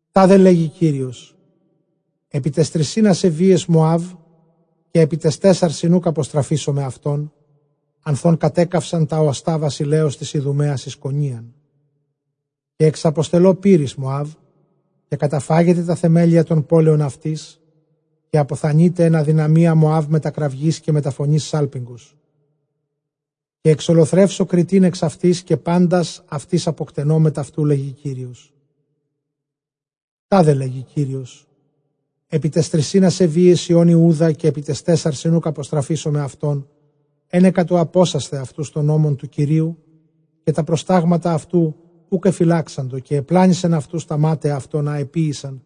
Τάδε λέγει Κύριος, ἐπὶ ταῖς τρισὶν ἀσεβείαις Μωὰβ, καὶ ἐπὶ ταῖς τέσσαρσιν οὐκ ἀποστραφήσομαι αὐτὸν, ἀνθʼ ὧν κατέκαυσαν τὰ ὀστᾶ βασιλέως τῆς Ἰδουμαίας εἰς κονίαν. Καὶ ἐξαποστελῶ πῦρ εἰς Μωὰβ, καὶ καταφάγεται τὰ θεμέλια τῶν πόλεων αὐτῆς, καὶ ἀποθανεῖται ἐν ἀδυναμίᾳ Μωὰβ μετὰ κραυγῆς καὶ μετὰ φωνῆς σάλπιγγος. Καὶ ἐξολοθρεύσω κριτὴν ἐξ αὐτῆς, καὶ πάντας [ἄρχοντας] αὐτῆς ἀποκτενῶ μετʼ αὐτοῦ, λέγει Κύριος. Τάδε λέγει Κύριος, ἐπὶ ταῖς τρισὶν ἀσεβείαις υἱῶν Ἰούδα, καὶ ἐπὶ ταῖς τέσσαρσιν οὐκ ἀποστραφήσουμαι αὐτὸν, ἕνεκα τοῦ ἀπώσασθαι αὐτοὺς τὸν νόμον τοῦ Κυρίου, καὶ τὰ προστάγματα αὐτοῦ οὐκ ἐφυλάξαντο, καὶ ἐπλάνησεν αὐτοὺς τὰ μάταια αὐτῶν ἃ ἐποίησαν,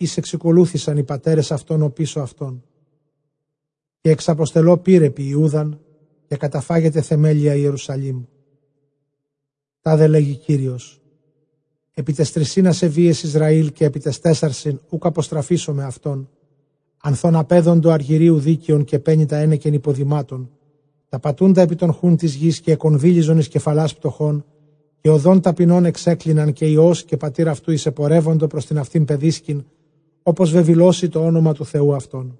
οἷς ἐξηκολούθησαν οἱ πατέρες αὐτῶν ὀπίσω αὐτῶν. Καὶ ἐξαποστελῶ πῦρ ἐπὶ Ἰούδαν, καὶ καταφάγεται θεμέλια Ἱερουσαλήμ. Τάδε λέγει Κύριος, ἐπὶ ταῖς τρισὶν ἀσεβείαις Ἰσραὴλ, καὶ ἐπὶ ταῖς τέσσαρσιν οὐκ ἀποστραφήσομαι αὐτὸν, ἀνθʼ ὧν ἀπέδοντο ἀργυρίου δίκαιον, καὶ πένητα ἕνεκεν ὑποδημάτων, τὰ πατοῦντα ἐπὶ τὸν χοῦν τῆς γῆς, καὶ ἐκονδύλιζον εἰς κεφαλὰς πτωχῶν, καὶ ὁδὸν ταπεινῶν ἐξέκλιναν, καὶ υἱὸς καὶ πατὴρ αὐτοῦ εἰσεπορεύοντο πρὸς τὴν αὐτὴν παιδίσκην, ὅπως βεβηλῶσι τὸ ὄνομα τοῦ Θεοῦ αὐτῶν.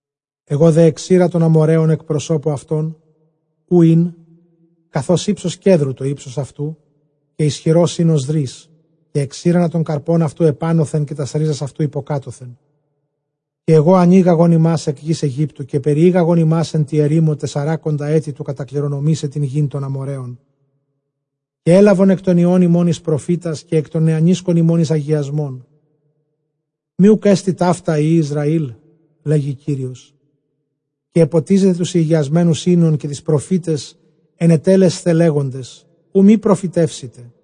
Ἐγὼ δὲ ἐξῇρα τὸν Ἀμοῤῥαῖον ἐκ προσώπου αὐτῶν, οὗ ἦν, καθὼς ὕψος κέδρου, τὸ ὕψος αὐτοῦ, καὶ ἰσχυρὸς ἦν ὡς δρῦς, καὶ ἐξήρανα τὸν καρπὸν αὐτοῦ ἐπάνωθεν, καὶ τὰς ῥίζας αὐτοῦ ὑποκάτωθεν. Καὶ ἐγὼ ἀνήγαγον ὑμᾶς ἐκ γῆς Αἰγύπτου, καὶ περιήγαγον ὑμᾶς ἐν τῇ ἐρήμῳ τεσσαράκοντα ἔτη, τοῦ κατακληρονομῆσαι τὴν γῆν τῶν Ἀμοῤῥαίων. Καὶ ἔλαβον ἐκ τῶν υἱῶν ὑμῶν εἰς προφήτας, καὶ ἐκ τῶν νεανίσκων ὑμῶν εἰς ἁγιασμόν· μὴ οὐκ ἔστι ταῦτα υἱοὶ Ἰσραήλ; λέγει Κύριος. Καὶ ἐποτίζετε τοὺς ἡγιασμένους οἶνον, καὶ τοῖς προφήταις ἐνετέλλεσθε λέγοντες, οὐ μὴ προφητεύσητε.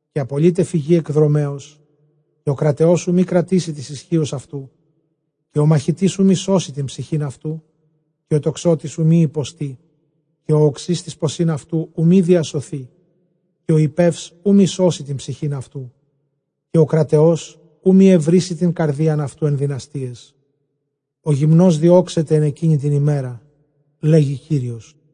Καὶ ἀπολεῖται φυγὴ ἐκ δρομέως, καὶ ὁ κραταιὸς οὐ μὴ κρατήσῃ τῆς ἰσχύος αὐτοῦ, καὶ ὁ μαχητὴς οὐ μὴ σώσῃ τὴν ψυχὴν αὐτοῦ. Καὶ ὁ τοξότης οὐ μὴ ὑποστῇ καὶ ὁ ὀξὺς τοῖς ποσὶν αὐτοῦ οὐ μὴ διασωθῇ, καὶ ὁ ἱππεὺς οὐ μὴ σώσῃ τὴν ψυχὴν αὐτοῦ, καὶ ὁ κραταιὸς οὐ μὴ εὑρήσει τὴν καρδίαν αὐτοῦ ἐν δυναστείαις, ὁ γυμνὸς διώξεται ἐν ἐκείνῃ τῇ ἡμέρᾳ, λέγει Κύριος.